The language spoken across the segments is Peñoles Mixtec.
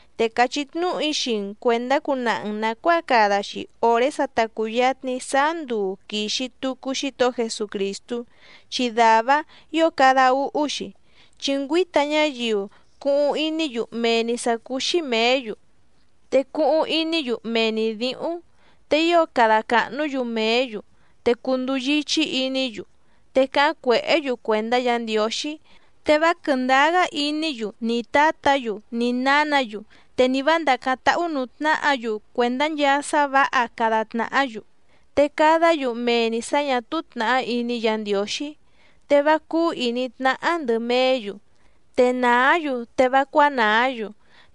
Te càchí tnúhu‑í xii‑n cuèndá cunaha‑n nàcuáa cada‑xi òré sa ta cùyatni sáá nduu quìxi tucu Xítohó Jesucrìstú, chi dàvá‑áⁿ ǐo cada úhú‑xi. Chi ngüíta ñáyiu cuhuⁿ iní‑yu mee‑ni sǎ cúú‑xí mèé‑yu, te cuhuⁿ iní‑yu mee‑ni dǐhúⁿ, te ío cada càhnú‑yu mèé‑yu, te cunduu yíchí iní‑yu, te cáháⁿ cuèhé‑yu cuèndá Yǎ Ndiǒxí, te vá quɨ̀ndáá‑gá iní‑yu ni tǎtǎ‑yu ni nǎnǎ‑yu, te ni vǎ ndàcáⁿ táhú nǔú tnáhǎ‑yu cuèndá nchaa sá vǎha cada tnàhá‑yu, te cadá‑yu mee‑ni sǎ ñà túú tnàhá iní Yǎ Ndiǒxí. Te vá cúú ìní tnáhá ndɨ̀ meé‑yu, te nàá‑yu te vá cuánàá‑yu,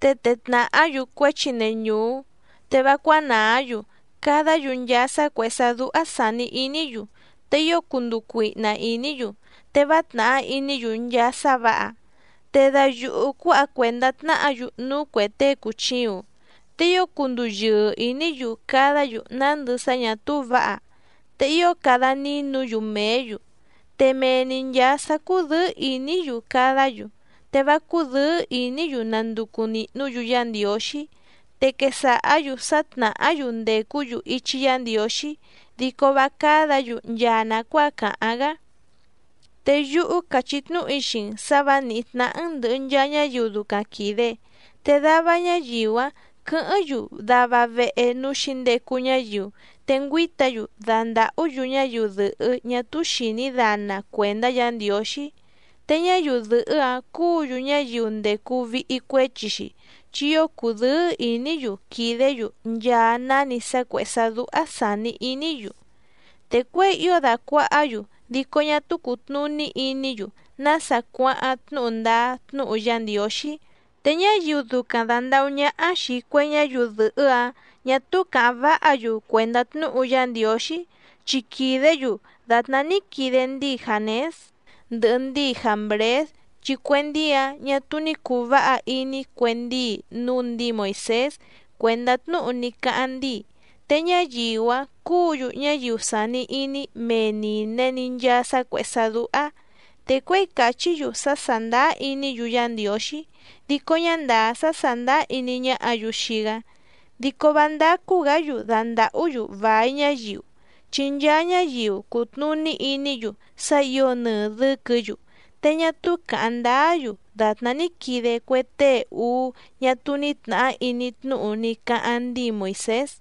te tee tnàhá‑yu cuéchi neñùú, te vá cuánàá‑yu cadá‑yu nchaa sá cuèhé sá dúhá sàni iní‑yu, te ío cunduu cuihna ìní‑yu, te vá tnàhá iní‑yu nchaa sá vǎha. Te dayuhu cuǎha cuèndá tnáhǎ‑yu núú cuè tée cùchiuⁿ, te ío cunduu yɨɨ ìní‑yu cadá‑yu nándɨ sá ñà túú vǎha, te ío cada nínu‑yu mèé‑yu, te mee‑ni nchàa sá cúdɨ̌ɨ́ ìní‑yu cadá‑yu, te vá cúdɨ̌ɨ́ ìní‑yu nanducu nìhnú‑yu Yá Ndiǒxí. Te quesàhá‑yu sá tnàhá‑yu ndècú‑yu ichi Yá Ndiǒxí dico vá cádǎ‑yu nchaa nàcuáa càháⁿ‑gá. Te yúhú càchí tnúhu‑í xii‑n sǎ vǎ nìhí tnáhá‑n ndɨ̀hɨ nchaa ñáyiu ducaⁿ quìde. Te dava ñáyiu‑áⁿ quɨ̌hɨ́ⁿ‑yu dava vehe núú xǐndecu ñáyiu, te ngüíta‑yu dandàhú‑yu ñáyiu dɨ̀hɨ́ ñá túú xìní dana cuèndá Yǎ Ndiǒxí, te ñáyiu dɨ̀hɨ́‑áⁿ cúǔ‑yu ñáyiu ndècu vihi cuéchi‑xi, chi ío cùdɨ́ɨ́ ìní‑yu quìdé‑yu nchaa náni sá cuèhé sá dúhá sàni iní‑yu. Te cuěi ío dàcuahá‑yu, dico ñá túú cùtnuní iní‑yu nása cuáháⁿ tnúhu ndáá tnúhu Yá Ndiǒxí. Te ñáyiu ducaⁿ dàndahú ñáhá xìi cue ñáyiu dɨ̀hɨ́‑áⁿ ñà túú càháⁿ váha‑yu cuèndá tnúhu Yá Ndiǒxí, chi quìdé‑yu dàtná ní quide ndíi Jǎnés ndɨhɨ ndíi Jǎmbrés chi cue ndíi‑áⁿ ñà túú ní cùu váha iní cue ndíi núú ndǐi Moìsés cuèndá tnúhu ní cáháⁿ ndíi. Te ñáyiu‑áⁿ cúǔ‑yu ñáyiu sàni iní mee nìne‑ni nchaa sá cuèhé sá dúhá, te cuěi càchí‑yu sá sàndáá iní‑yu Yá Ndiǒxí dico ñá ndàá sá sàndáá iní ñáhǎ‑yu xii‑gá. Dico vá ndácú‑gǎ‑yu dandàhú‑yu vài ñáyiu, chi nchaa ñáyiu cutnùní iní‑yu sá ǐo nɨɨ dɨ̌quɨ̌‑yu, te ñá túú càháⁿ ndáá‑yu dàtná ní quide cue tée úú ñá túú ní tnàhá iní tnúhu ní cáháⁿ ndíi Moìsés.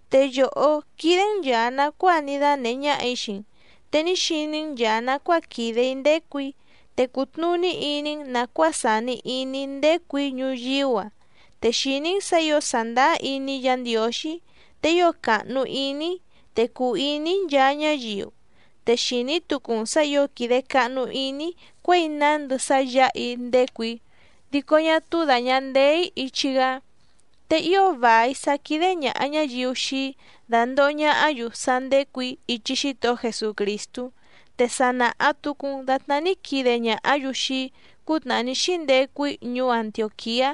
Te yòhó quídé‑n nchàa nacuáa ní dánèhé ñáhà‑í xii‑n, te ní xiní‑n nchàa nacuáa quìde‑í ndécù‑í, te cùtnuní iní‑n nàcuáa sàni iní‑í ndécù‑í ñuyíú‑a, te xìní‑n sǎ ǐo sàndáá iní‑í Yǎ Ndiǒxí, te ío càhnu iní‑í, te cùu iní‑í nchaa ñáyiu, te xìní tucu‑n sǎ ǐo quìde cahnu iní‑í cuěi nándɨ sá yǎha‑í ndécù‑í dico ñá túú dàña ndeé‑í ichi‑gá. Te ío vài sá quídé ñàha ñáyiu xii‑í dándòho ñahá‑yu sá ndécù‑í ichi Xítohó Jesucrìstú, te sa nàha tucu‑n datná ní quide ñàhá‑yu xii‑í cútnàhá ní xíndecu‑í ñuú Antiòquiá,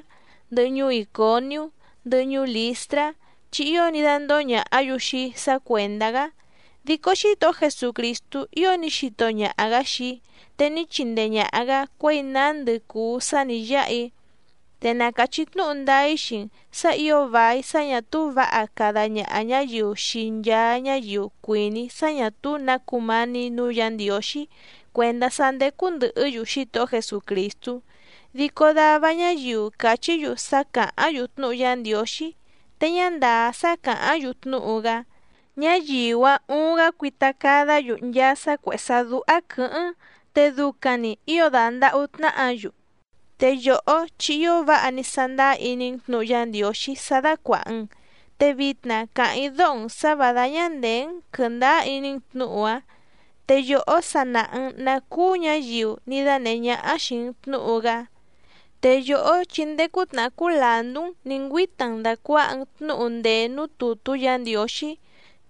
ndɨhɨ ñuú Ìconiú, ndɨhɨ ñuú Lìstrá, chi ío ní dándóhó ñàhá‑yu xii‑í sá cuèndá‑gá. Dico Xítohó Jesucrìstú ío ní xito ñaha‑gǎ xii‑í te ní chindee ñàha‑gá cuěi nándɨ cùu sá nǐ yáha‑í. Te na càchí tnúhu ndáá‑í xii‑n sǎ ǐo vài sá ñà túú vǎha cada ñaha ñǎyiu xii nchaa ñáyiu cuìní sá ñà túú nǎ cumání nǔú Yǎ Ndiǒxí cuèndá sá ndécú ndɨ̀hɨ́‑yu Xítohó Jesucrìstú. Dico dava ñáyiu càchí‑yu sá càháⁿ‑yu tnúhu Yá Ndiǒxí te ñá ndàá sá càháⁿ‑yu tnúhu‑gá, ñáyiu‑áⁿ uuⁿ‑gá cuita cada‑gá‑yu nchaa sá cuèhé sá dúhá quɨ̌hɨ́ⁿ, te ducaⁿ‑ni ǐo dandàhú tnáhǎ‑yu. Te yòhó chi ío váha ní sándáá iní‑n tnǔhu Yá Ndiǒxí sá dácuàha‑n, te vitna càháⁿ‑í dóho‑n sǎ vǎ dáñá ndèé‑n quɨ̀ndáá iní‑n tnǔhu‑áⁿ, te yòhó sa nàha‑n ná cúú ñǎyiu ní dánèhé ñáhá xìi‑n tnúhu‑gá. Te yòhó chi ndéé cútnàhá cúú làndú‑n nǐ ngüíta‑n dàcuaha‑n tnúhu ndèé núú tùtú Yǎ Ndiǒxí,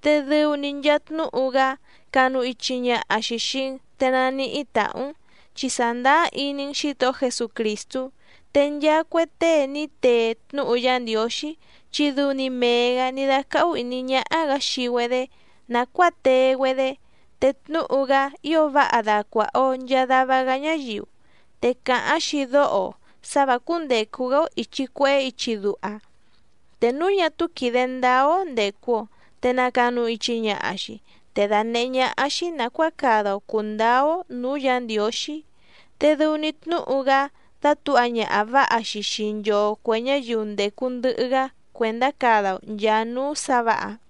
te dɨu‑ni nchaa tnúhu‑gá canu ichi ñaha‑xi xìi‑n te naníhí tàhú‑n, chi sàndáá iní‑n Xǐtohó Jesucrìstú. Te nchaa cue tée ní tee tnúhu Yá Ndiǒxí, chi dɨu‑ni mee‑gǎ ní dácáhú ìní ñáhá‑gǎ xii‑güedé nàcuáa tee‑güedé, te tnúhu‑gá ío váha dacuàha‑o nchaa dava‑gá ñáyiu, te càháⁿ‑xi dóho‑o sǎ vǎ cúndècu‑gá‑ó ìchi cuehé ichi duha, te núu ñá túú quìde ndáá‑ó ndècu‑o te nàcanu ichi ñaha‑xi, te dànehé ñáhá‑xí nàcuáa cada‑o cùndáá‑ó nǔú Yǎ Ndiǒxí. Te dɨu‑ni tnúhu‑gá dátǔha ñaha vǎha‑xi xii nchoo cuè ñáyiu ndècu ndɨhɨ‑gá cuèndá cada‑o nchàa núú sǎ vǎha.